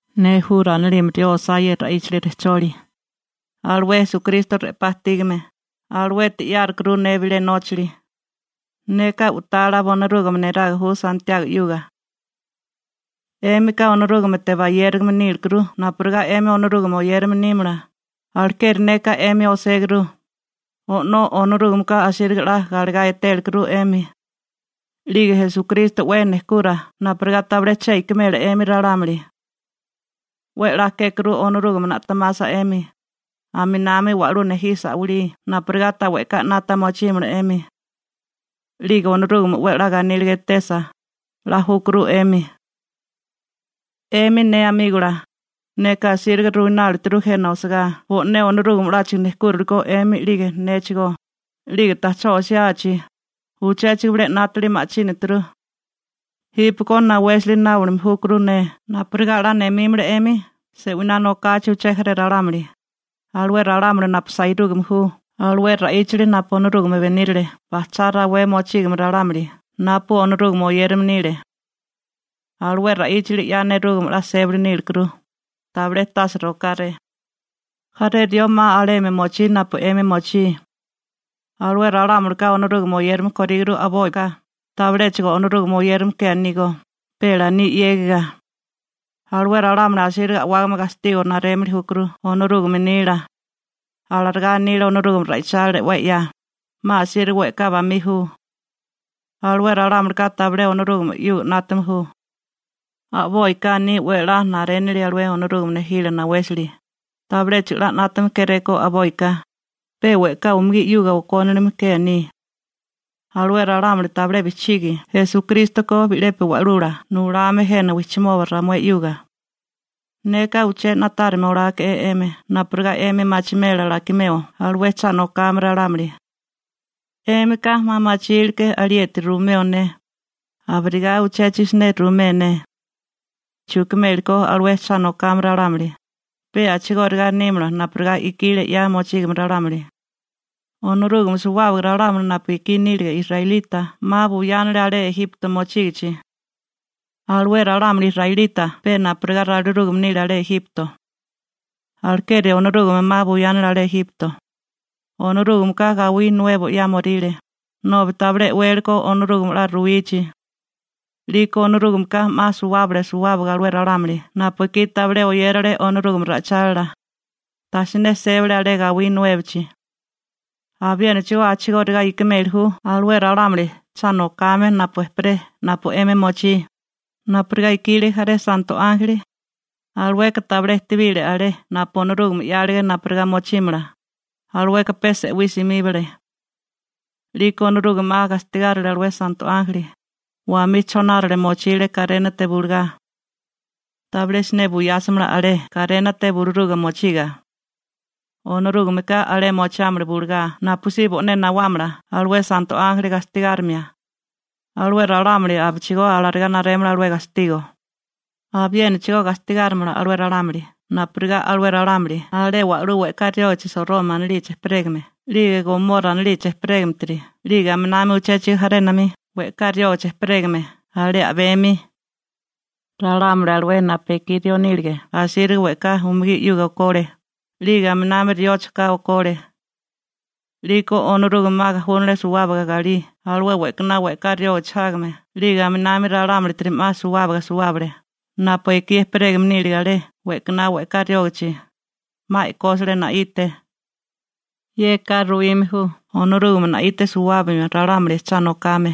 Ne Jura anilime rió osá ye ra'íchali rejcholi. Alué Esukristo re'pá ajtígame, aluete 'yárukuru ne bilé nóchali. Neka u'tala bonirúgame niraga ju Santiago 'yuga. 'Émika Onorúgamete bayérigame nílekuru napurigá 'emi Onorúgame oyérame nímala, alekeri neka 'emi oséguru. O'nó Onorúgameka asíriga 'la galegá etélekuru 'emi. 'Lige Esukristo 'we nejkura napurigá tabilé che ikimela 'emi ralámuli. 'We 'la kékuru Onorúgame na'temasa 'emi, aminami wa'lú nejisa a'walí napurigá ta we'ká 'nata mochímala 'emi. 'Lige Onorúgame 'we 'la ganíliga etesa, 'la júkuru 'emi. 'Emi ne amígola, neka asíriga ruinálituru jena osagá bo'né Onorúgame 'láchigo nejkúrilikó 'emi 'lige néchigó, 'lige ta'chó osiachi, uchéchigo bilé 'nátili ma'chínaturu. Jípeko nawésali náomili júkuru ne napurigá 'la nemímala 'emi se'winá nokachi uché jaré ralámuli, alué ralámuli napu sairúgame ju alué ra'íchali napu Onorúgame benírale bajchá rawé mochígame ralámuli napu Onorúgame oyérame nile. Alué ra'íchali 'ya nerúgame 'la sébali nílikuru, tabilé tase rokáré. Jaré rió 'ma alemi mochí napu 'emi mochí. Alué ralámulika Onorúgame oyérame koríguru a'boika, tabiléchigo Onorúgame oyérame ke anígó, pe laní 'yégiga. Alué ralámuli asíriga a'wágame gastigo narémili júkuru Onorúgame nila. Alarigá anile Onorúgame ra'ichálila 'we 'ya, 'ma asíriga we'ká bamí ju. Alué ralámulika tabilé Onorúgame 'yuga 'nátame ju. A'boika aní 'we 'la narénili alué Onorúgame nejílala nawésali, tabiléchigo 'la 'nátame kéréko a'boika, pe we'ká umugí 'yuga okónilime ke aní. Alué ralámuli tabilé bijchigi Esukristo ko bi'lepi wa'lula nulame jena wijchimoba ramué 'yuga. Neka uché na'tárime oláeke'é 'emi napurigá 'emi machimela alakimeo alué cha nokame ralámuli. 'Émika 'ma machílké alieti ruimeo ne, abirigá uchéchigo siné ruimé ne alué chukimeli ko alué cha nokame ralámuli, pe a'chigóriga nímala napurigá ikílige 'ya mochígame ralámuli. Onorúgame suwábaga ralámuli napu ekí nílige israelita 'ma buyánale alé Ejipto mochígichi. Alué ralámuli israelita pe napurigá ralirúgame nile alé Ejipto. Alekeri Onorúgame 'ma buyánale alé Ejipto. Onorúgameka gawí nuebo 'yámoríle, nobi tabilé e'wele ko Onorúgame 'la ruwichi. 'Liko Onorúgameka 'ma suwábale suwábaga alué ralámuli napu ekí tabilé oyérale Onorúgame ra'ichálila, tasiné sébale alé gawí nuébochi. Abiénachigó a'chigóriga ikimeli ju alué ralámuli cha nokame napu ejperé napu 'emi mochí, napurigá ikile jaré santo ánjeli. Alueka tabilé ejtebile alé napu Onorúgame 'yálige napurigá mochímala, alueka pe se'wí simíbale. 'Liko Onorúgame 'ma gastigárile alué santo ánjeli, wamí chonárale mochile karénate bulugá. Tabilé siné buyásamala alé karénate buluruga mochiga. Onorúgameka alé mochiámala bulugá napusí bo'né nawámala alué santo ánjeli gastigárimia. Alué ralámuli abichigó alarigá narémala alué gastigo. Abiénachigó gastigárimala alué ralámuli napurigá alué ralámuli alé wa'lú we'ká riógichi Soroma anilichi ejperégame 'lige Gomora anilichi ejperégametiri 'lige aminami uchéchigo jarénami we'ká riógichi ejperégame alé a'bemi. Ralámuli alué napu ekí rió nílige asíriga we'ká umugí 'yuga okole, 'lige aminami riocho ka okole. 'Liko Onorúgame 'ma gajúnale suwábaga galí alué we'kaná we'ká riógichi jágame 'lige aminami ralámulitiri 'ma suwábaga suwábale napu ekí ejperégame nílige alé we'kaná we'ká riógichi, 'ma e'kósale na'ite. Yeka ruwime ju Onorúgame na'ite suwábimio ralámuli cha nokame,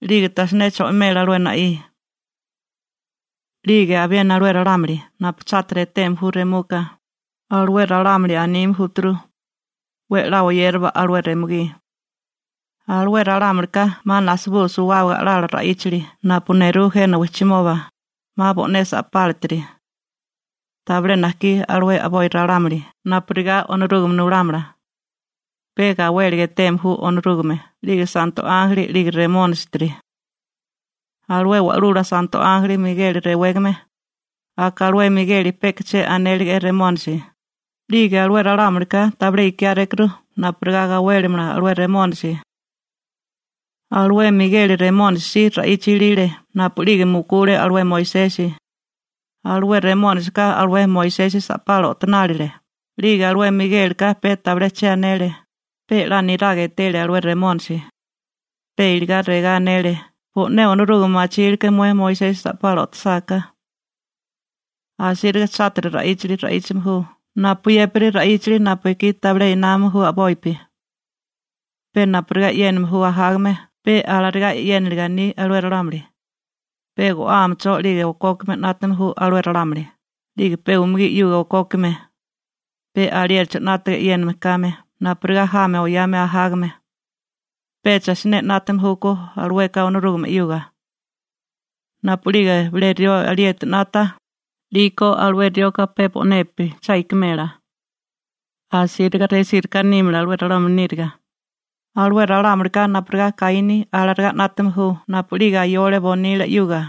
'lige tajsiné cho'imela alué na'í. 'Lige abiena alué ralámuli napu chátiri eteme ju remuka, alué ralámuli anime júturu: «'We 'la oyérawa alué remugí.» Alué ralámulika 'ma najsabú suwábaga a'lala ra'íchali napu nerú jena wijchimoba, 'ma bo'né sa'pálatiri. Tabilé najkí alué a'boi ralámuli napurigá Onorúgame nulámala. Pe gawéliga eteme ju Onorúgame 'lige santo ánjeli 'lige Remónisitiri. Alué wa'lula santo ánjeli Migeli rewégame, aka alué Migeli peka che anélige'é Remónisi, 'lige alué ralámulika tabilé ikiárékuru napurigá gawélimala alué Remónisi. Alué Migeli Remónisi si ra'icha ilile napu'lige mukule alué Moisesi. Alué Remónisika alué Moisesi sa'pala o'tonálile, 'lige alué Migélika pe tabilé che anele, pe 'la niraga etele alué Remónisi. Pe iligá regá anele: «Bo'né Onorúgame machílké mué Moisesi sa'pala o'tosáká.» Asíriga chátiri ra'íchali ra'íchame ju napuyépiri ra'íchali napu ekí tabilé námame ju a'bopi. Pe napurigá e'yéname ju ajágame pe alarigá e'yéniniliga aní alué ralámuli, pe go'ámecho 'lige okókime 'nátame ju alué ralámuli, 'lige pe umugí 'yuga okókime. Pe aliéricho 'nátaga e'yéname kame napurigá jami oyame ajágame. Pecha siné 'nátame júkó alueka Onorúgame 'yuga. Napu'lige bilé rió alieti 'nata, 'liko alué rioka pe bo'nepi cha ikimela. Asíriga resíriká nímala alué ralámuli níriga. Alué ralámulika napurigá Kaíni alarigá 'nátame ju napu'lige ayole bonila 'yuga.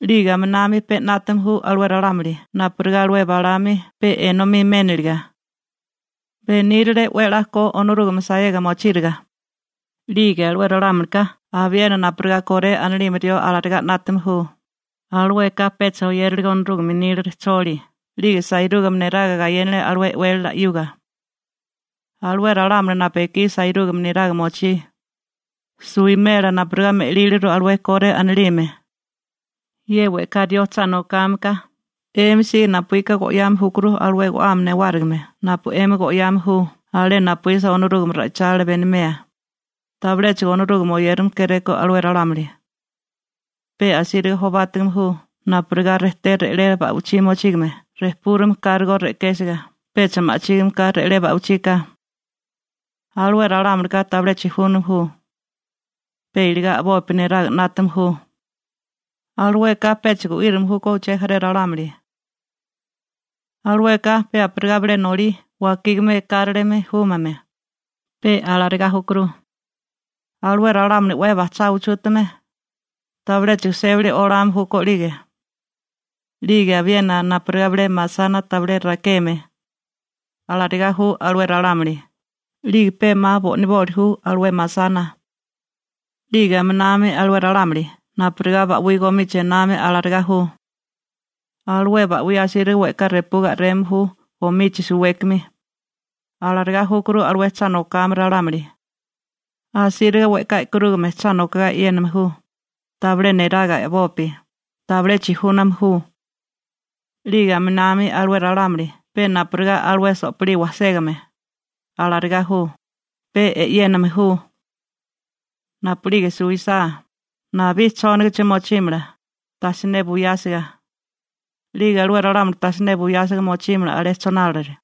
'Lige aminami pe 'nátame ju alué ralámuli napurigá alué Balaámi pe enomí méniliga. Benírale 'we 'la ko Onorúgame saega mochíriga. 'Lige alué ralámulika abiena napurigá Koré anilime rió alarigá 'nátame ju, alueka pecha oyéralega Onorúgame nila rejcholi 'lige sairúgame neraga gayénale alué e'wélala 'yuga. Alué ralámuli napu ekí sairúgame neraga mochí, suwimela napurigá me'líliru alué Koré anilime. Ye we'ká rió cha nokáme ka 'emi si napuíka go'yame júkuru alué go'ame newárigime napu 'emi go'yame ju alé napuísa Onorúgame ra'ichálila benimea, tabiléchigo Onorúgame oyérame kéréko alué ralámuli. Pe asíriga jobátigame ju napurigá rejté re'lé ba'ichí mochígame rejpúrame kárigó re'késiga pecha ma'chígime ka re'lé ba'ichika. Alué ralámulika tabilé chijúname ju. Pe iligá a'bopi niraga 'nátame ju. Alueka pecha gu'írame júkó uché jaré ralámuli. Alueka pe napurigá bilé nolí wakígame ekáralimi júmame, pe alarigá júkuru. Alué ralámuli 'we bajchá uchútame, tabiléchigo sébali olame júkó 'lige. 'Lige abiena napurigá bilé masana tabilé rakeme, alarigá ju alué ralámuli, 'lige pe 'ma bo'niboli ju alué masana. 'Lige aminami alué ralámuli napurigá ba'wí gomichi ename alarigá ju. Alué ba'wí asíriga we'ká repuga a'reme ju gomichi suwékimi. Alarigá júkuru alué cha nokame ralámuli. Asíriga we'ká e'karúgame cha nokogá e'yéname ju, tabilé niraga a'bopi. Tabilé chijúname ju. 'Lige aminami alué ralámuli pe napurigá alué so'pilí wajségame, alarigá ju, pe e'yéname ju. Napu'lige suwisá, nabí chónagachi mochímala, tasiné buyásiga. 'Lige alué ralámuli tajsiné buyásiga mochímala alé chonárale.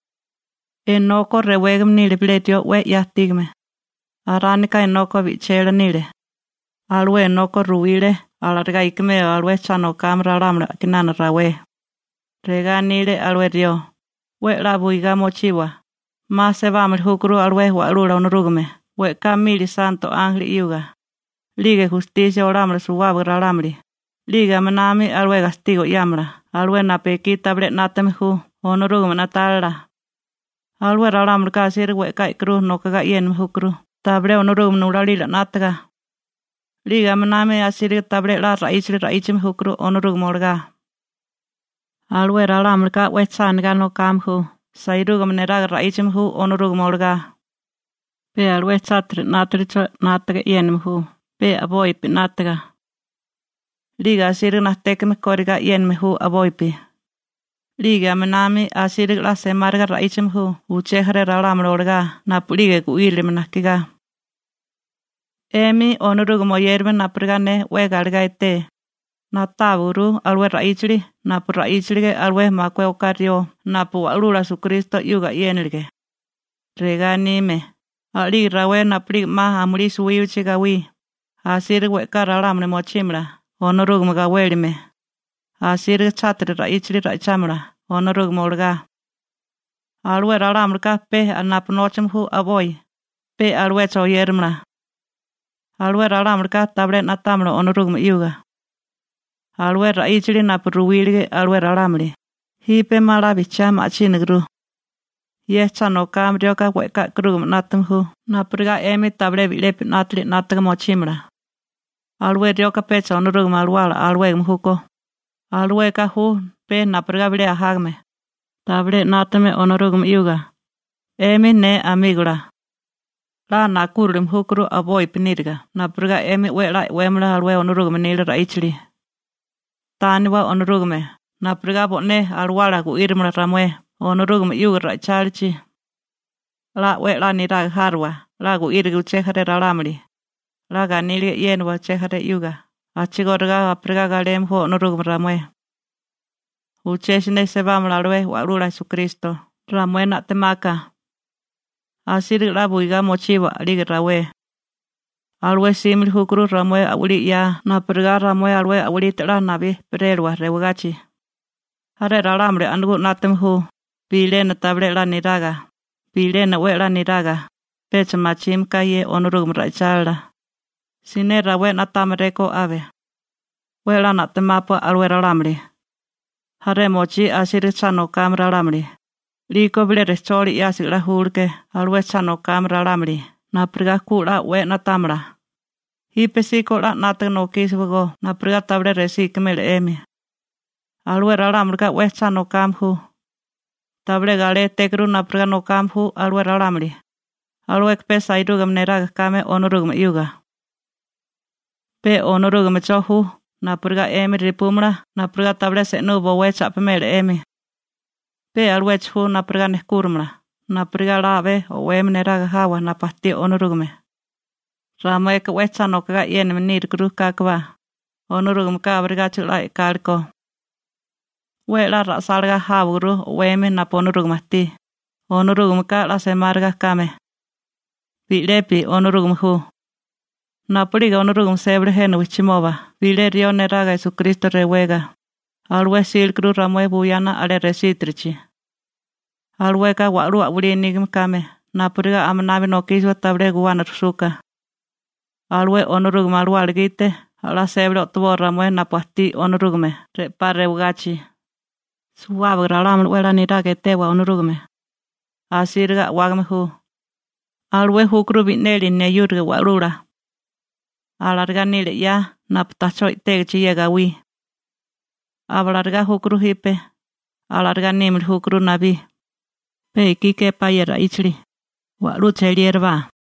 Enoko rewégame nile bilé rió 'we 'ya ajtígame. Aránika Enoko bi'chela nile. Alué Enoko ruwile alarigá ikimeo alué cha nokame ralámuli a'kinana rawé. Regá anile alué rió: «'We 'la buigá mochiwa, 'ma sebámili júkuru alué Wa'lula Onorúgame we'ká mili santo ánjeli 'yuga, 'lige gustisia olámala suwábaga ralámuli, 'lige aminami alué gastigo 'yámala alué napu ekí tabilé 'nátame ju Onorúgame na'tálila. Alué ralámulika asíriga we'ká e'karú nokogá e'yéname júkuru tabilé Onorúgame nulalila 'nátaga. 'Lige aminami asíriga tabilé 'la ra'íchali ra'íchame júkuru Onorúgame olagá.» Alué ralámulika 'we cha anigá nokame ju sairúgame neraga ra'íchame ju Onorúgame olagá. Pe alué chátiri 'nátalicho 'nátaga e'yéname ju pe a'bopi 'nátaga. 'Lige asíriga najtékame korigá e'yéname ju a'bopi. 'Lige aminami asíriga 'la semáriga ra'íchame ju uché jaré ralámuli olagá napu'lige gu'írilime najkigá. 'Emi Onorúgame oyérame napu ne 'we galegá eté, na'táwaguru alué ra'íchali napu ra'íchilige alué makué oká rió napu Wa'lula Esukristo 'yuga e'yénilige. Regá anime: «A'lige rawé napu'lige 'ma amulí suwíbachi gawí, asíriga we'ká ralámuli mochímala Onorúgame gawélime, asíriga chátiri ra'íchali ra'ichámala Onorúgame olagá. Alué ralámulika pe napu nóchame ju a'boi, pe aluecho oyéramala. Alué ralámulika tabilé na'támala Onorúgame 'yuga.» Alué ra'íchali napu ruwílige alué ralámuli, jipe 'ma 'la bijchiá ma'chínaguru. Ye cha nokame rioka we'ká e'karúgame 'nátame ju napurigá 'emi tabilé bi'lepi 'nátili 'nátaga mochímala. Alué rioka pecha Onorúgame Alawala alawégame júkó, alueka ju pe napurigá bilé ajágame, tabilé 'nátame Onorúgame 'yuga. 'Emi ne amígola, 'la nakúrilime júkuru a'bopi níriga napurigá 'emi 'we 'la e'wémala alué Onorúgame nila ra'íchali. Tániwa Onorúgame napurigá bo'né alawala gu'írimala ramué Onorúgame 'yuga ra'ichálichi. 'La 'we 'la niraga járiwa 'la gu'íriga uché jaré ralámuli, 'la ganíliga e'yéniwa uché jaré 'yuga a'chigóriga napurigá galeme ju Onorúgame ramué. Uché siné sebámala alué Wa'lula Esukristo ramué na'temaka. Asíriga 'la buigá mochiwa a'lige rawé. Alué 'símili júkuru ramué a'walí 'ya napurigá ramué alué a'walite 'la nabí ejperélawa rewagachi. Jaré ralámuli a'nagú 'nátame ju, bilena tabilé 'la niraga, bilena 'we 'la niraga, pecha machime ka ye Onorúgame ra'ichálila. Siné rawé na'támaréko abe. 'We 'la na'temápua alué ralámuli. Jaré mochí asíriga cha nokame ralámuli. 'Liko bilé rejcholi 'yásiga 'la júleké alué cha nokame ralámuli napurigá ku 'la o'wé na'támala. Jípesíko 'la 'nátaga nokísiwagó napurigá tabilé resí ikimela 'emi. Alué ralámulika 'we cha nokame ju. Tabilé galétékuru napurigá nokame ju alué ralámuli, alueka pe sairúgame neraga kame Onorúgame 'yuga. Pe Onorúgamecho ju napurigá 'emi repúmala napurigá tabilé se'nú bowé cha'pimela 'emi. Pe aluecho ju napurigá nejkúrimala napurigá 'la a'bé o'wemi neraga jawa napu ajtí Onorúgame. Ramueka 'we cha nokogá e'yéname nírikuru kákobá, Onorúgameka abirigáchigo 'la e'kale ko. 'We 'la ra'sálagá jáwaguru o'wemi napu Onorúgame ajtí, Onorúgameka 'la semáriga kame. Bi'lepi Onorúgame ju. Napu'lige Onorúgame sébale jena wijchimoba bilé rió neraga Esukristo rewega, alué 'sílekuru ramué buyana alé resítirichi. Alueka wa'lú a'walí nígame kame napurigá aminabi nokísiwa tabilé guwana rusuka. Alué Onorúgame Alawala gite a'lá sébali o'toboa ramué napu ajtí Onorúgame re'pá rewagachi. Suwábaga ralámuli 'we 'la niraga etewa Onorúgame. Asíriga a'wágame ju. Alué júkuru bi'neli neyúriga Wa'lula. Alarigá nile 'ya napu ta'chó i'tégichi ye gawí. Abalarigá júkuru jipe, alarigá nímili júkuru nabí. Pe ekí képá ye ra'íchali. Wa'lú cheliérabá.